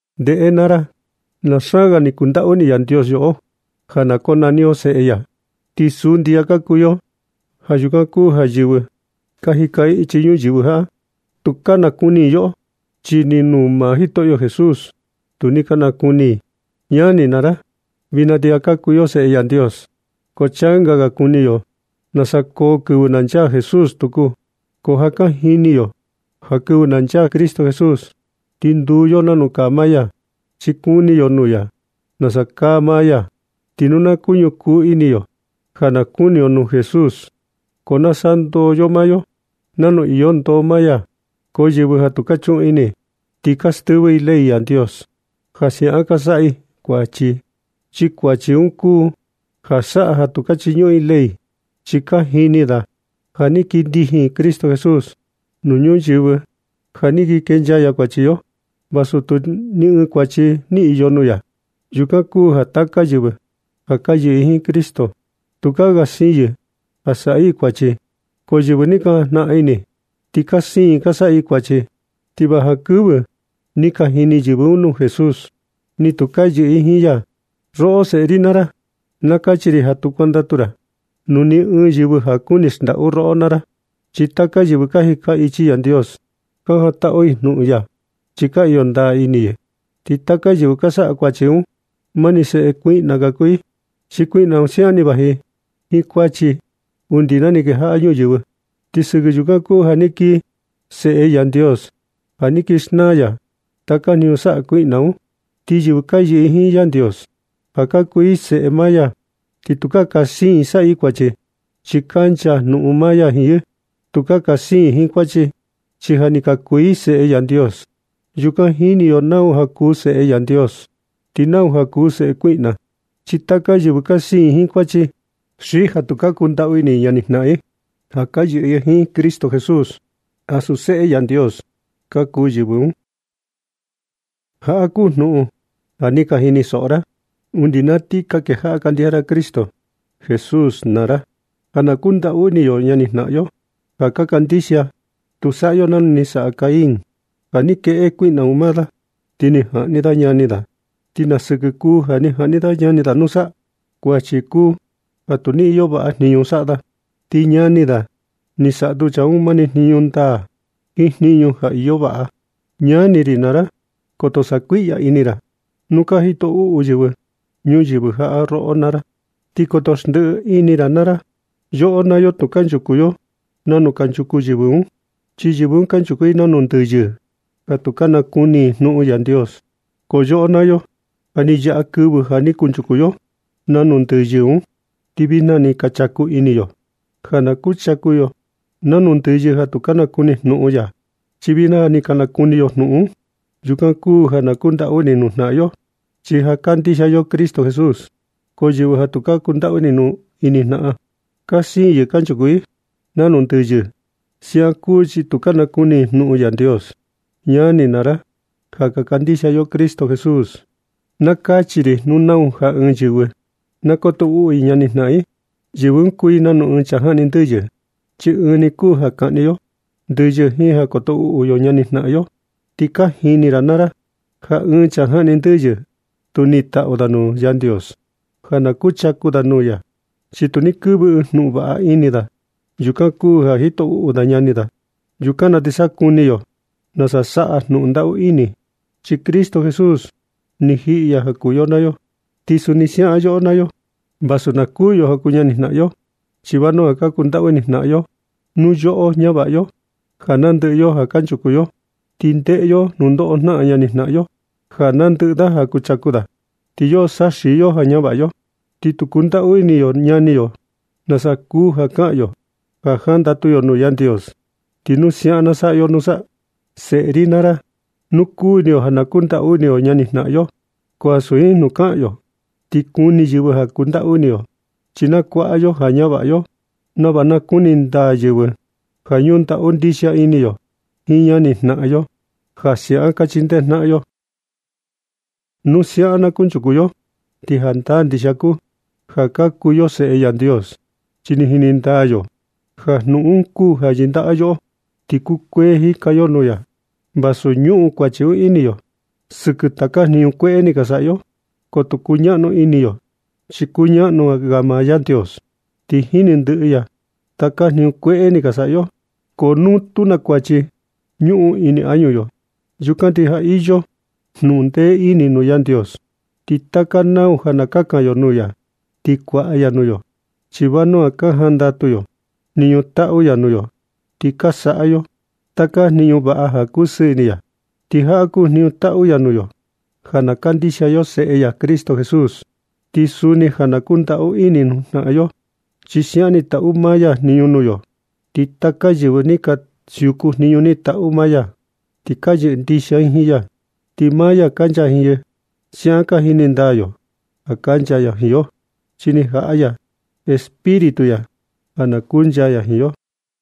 Ndeꞌe naa ra, na xaan ga ni kundaꞌu ini Yandios yoꞌo ja na konani yo seꞌe ya, ti suu ndixia ka kuu yo. Ja yukan kuu ja yɨvɨ ka jika ichi ñuyɨvɨ jaꞌa, tu ka nakuni i yoꞌo, chi ni nuu maa Jitoꞌo Jesús, tu ni ka nakuni i. Ñani naa ra, vijna ti ja ka kuu yo seꞌe Yandios, ko changa ga kuni yo nasa koo yo kɨvɨ na nchaa Jesús tuku. Ko ja ka jini yo ja kɨvɨ na nchaa Cristo Jesús, ti nduu yo nanu kaa maa ya, chi kuni yo nuu ya nasa kaa maa ya. Ti nu ka ñukuu ini yo ja na kuni yo nuu Jesús, ko na sandoo yo maa yo nanu iyo ndoo maa ya. Ko yɨvɨ ja tu ka chuꞌun ini, ti ka stɨvɨ i ley Yandios ja siaꞌan ka saꞌa i kuachi. Chi kuachi un kuu ja saꞌa ja tu ka chiñuꞌun i ley un. Chi ka jini ra ja ni kii indjin Cristo Jesús nuu ñuyɨvɨ ja ni kii kenchaa ya kuachi yo, vasu tu ni ɨɨn kuachi ni iyo nuu ya. Yukan kuu ja taka yɨvɨ ja ka yɨꞌɨ jiin Cristo, tukaa ga siin yɨ ja saꞌa i kuachi. Ko yɨvɨ ni ka jajnaꞌan ini ti ka siin i ka saꞌa i kuachi, ti va jankɨvɨ ni ka jini yɨvɨ un nuu Jesús, ni tu ka yɨꞌɨ i jiin ya. Roꞌo, seꞌe ri naa ra, na kachi ri ja tu kuandatu ra nuu ni ɨɨn yɨvɨ ja ka kuni xndaꞌu roꞌo naa ra. Chi taka yɨvɨ ka jika ichi Yandios, ka jandatu i jnuꞌun ya, chi ka iyo ndaa ini i. Ti taka yɨvɨ ka saꞌa kuachi un, mani seꞌe kuiꞌna ka kuu i, chi kuiꞌna un siaꞌan ni vaji jiin kuachi undi na ni kejaꞌa ñuyɨvɨ. Ti sɨkɨ yukan kuu ja ni kii Seꞌe Yandios ja ni kii xnaa ya taka jniñu saꞌa kuiꞌna un. Ti yɨvɨ ka yɨꞌɨ jiin Yandios ja ka kuu i seꞌe maa ya, ti tukaa ka siin i saꞌa i kuachi, chi kancha jnuꞌun maa ya jiin yɨ. Tukaa ga ka siin i jiin kuachi, chi ja ni ka kuu i seꞌe Yandios. Yukan jini yo nau ja kuu seꞌe Yandios ti nau ja kuu seꞌe kuiꞌna, chi taka yɨvɨ ka siin jiin kuachi xi ja tu ka kundaꞌu ini ñani jnaꞌan i ja ka yɨꞌɨ jiin Cristo Jesús, ansu seꞌe Yandios ka kuu yɨvɨ un. Jaꞌa kuu jnuꞌun ja ni ka jinisoꞌo ra undi na ni ka kejaꞌa ka kandixia ra Cristo Jesús naa ra, ja na kundaꞌu ini yo ñani jnaꞌan yo ka kandixia. Tu saꞌa yo nanu ni saꞌa Cain, ja ni kueꞌe kuiꞌna kuu un maa da, ti ni jaꞌni da ñani da. ¿Ti na siɨkɨ kuu ja ni jaꞌni da ñani da nusa? Kuachi kuu ja tu ni iyo vaꞌa jniñu saꞌa da. Ti ñani da, ni saꞌa tu chaa un mani jniñu ndaa, ɨɨn jniñu ja iyo vaꞌa. Ñani ri naa ra, koto saꞌa kuiꞌya ini ra, nu ka jito uꞌu yɨvɨ ñuyɨvɨ jaꞌa roꞌo naa ra, ti koto xndiꞌi ini ra naa ra. Yoꞌo naa yo tu kanchuku yo nanu kunchuku yɨvɨ un, chi yɨvɨ un kanchuku i nanu ndɨyɨ ja tu ka nakuni jnuꞌun Yandios. Ko yoꞌo naa yo, ja ni yaꞌa kɨvɨ ja ni kunchuku yo nanu ndɨyɨ un, ti vijna ni ka nachaku ini yo ja na kuchaku yo nanu ndɨyɨ ja tu ka nakuni jnuꞌun ya, chi vijna ja ni ka nakuni yo jnuꞌun un. Yukan kuu ja ka kundaꞌu ini nuu jnaꞌan yo, chi ja kandixia yo Cristo Jesús. Ko yɨvɨ ja tu ka kundaꞌu ini nuu ñani jnaꞌan un, ka siin i kanchuku i nanu ndɨyɨ. Siaꞌan kuu chi tu ka nakuni i jnuꞌun Yandios. Ñani naa ra ja ka kandixia yo Cristo Jesús, na kachi ri ja nu nau ɨɨn yɨvɨ na koto uꞌu i ñani jnaꞌan i, yɨvɨ un kuu i nanu ɨɨn chaa jaꞌni ndɨyɨ, chi ɨɨn ni kuu ja kaꞌni yo ndɨyɨ jiin ja koto uꞌu yo ñani jnaꞌan yo. Ti ka jini ra naa ra ja ɨɨn chaa jaꞌni ndɨyɨ tu niꞌin taꞌu da nuu Yandios ja na kuchaku da nuu ya, chi tu ni kɨvɨ ɨɨn jnuꞌun vaꞌa un ini da. Yukan kuu ja jito uꞌu da ñani da. Yukan na ti sa kuni yo nasa saꞌa jnuꞌun ndaꞌu ini, chi Cristo Jesús ni jiꞌi ya ja kuu yoꞌo naa yo. Ti suni siaꞌan yoꞌo naa yo vasu na kuū yo ja kuu ñani jnaꞌan yo, chi vanua ka kundaꞌu ini jnaꞌan yo. Nu yoꞌo ñavaꞌa yo ja nandɨꞌɨ yo ja kuchaku yo, ti ndeꞌe yo nundoꞌo jnaꞌan ñani jnaꞌan yo, ja nandɨꞌɨ da ja kuchaku da, ti yoꞌo saxii yo ja ñavaꞌa yo, ti tu kundaꞌu ini yo ñani yo, ¿nasa kuu ja kaꞌan yo ja jandatu yo jnuꞌun Yandios, ti nu siaꞌan na saꞌa yo nusa? Seꞌe ri naa ra, nu kuni yo ja na kundaꞌu ini yo ñani jnaꞌan yo, ko ansu jiin jnuꞌun kaꞌan yo ti kuni yɨvɨ ja kundaꞌu ini yo, chi na kuaꞌa yo ja ñavaꞌa yo nava na kuni ndaa yɨvɨ ja ñundaꞌu ndixia ini yo jiin ñani jnaꞌan yo, ja siaꞌan ka chindee jnaꞌan yo. Nu siaꞌan na kunchuku yo, ti jandaa ndixia kuu ka kuu yo seꞌe Yandios, chi jini ndaa yo ja jnuꞌun un kuu ja yɨndaꞌa yoꞌo, ti kukuee jika yo nuu ya, vasu ñuꞌun kuachi un ini yo sɨkɨ taka jniñu kueꞌe ni ka saꞌa yo. Ko tu kuñaꞌnu ini yo, chi kuñaꞌnu ga maa Yandios, ti jini ndɨꞌɨ ya taka jniñu kueꞌe ni ka saꞌa yo. Ko nu tu na kuachi ñuꞌun ini añu yo, yukan ti ja iyo jnuꞌun ndee ini nuu Yandios. Ti taka nau ja na kakan yo nuu ya, ti kuaꞌa ya nuu yo, chi vanua ka jandatu yo jniñu taꞌu ya nuu yo, ti ka saꞌa yo taka jniñu vaꞌa ja na kusɨɨ ini ya. Ti jaꞌa kuu jniñu taꞌu ya nuu yo, ja na kandixia yo Seꞌe ya Cristo Jesús, ti suni ja na kundaꞌu ini nuu jnaꞌan yo, chi siaꞌan ni taꞌu maa ya jniñu nuu yo. Ti taka yɨvɨ ka siuku jniñu ni taꞌu ya, ti ka yɨꞌɨ ndixia i jiin ya, ti maa ya kancha jiin yɨ. Siaꞌan ka jini ndaa yo ja kancha ya jiin yo, chi ni jaꞌa ya Espíritu ya ja na kuncha ya jiin yo.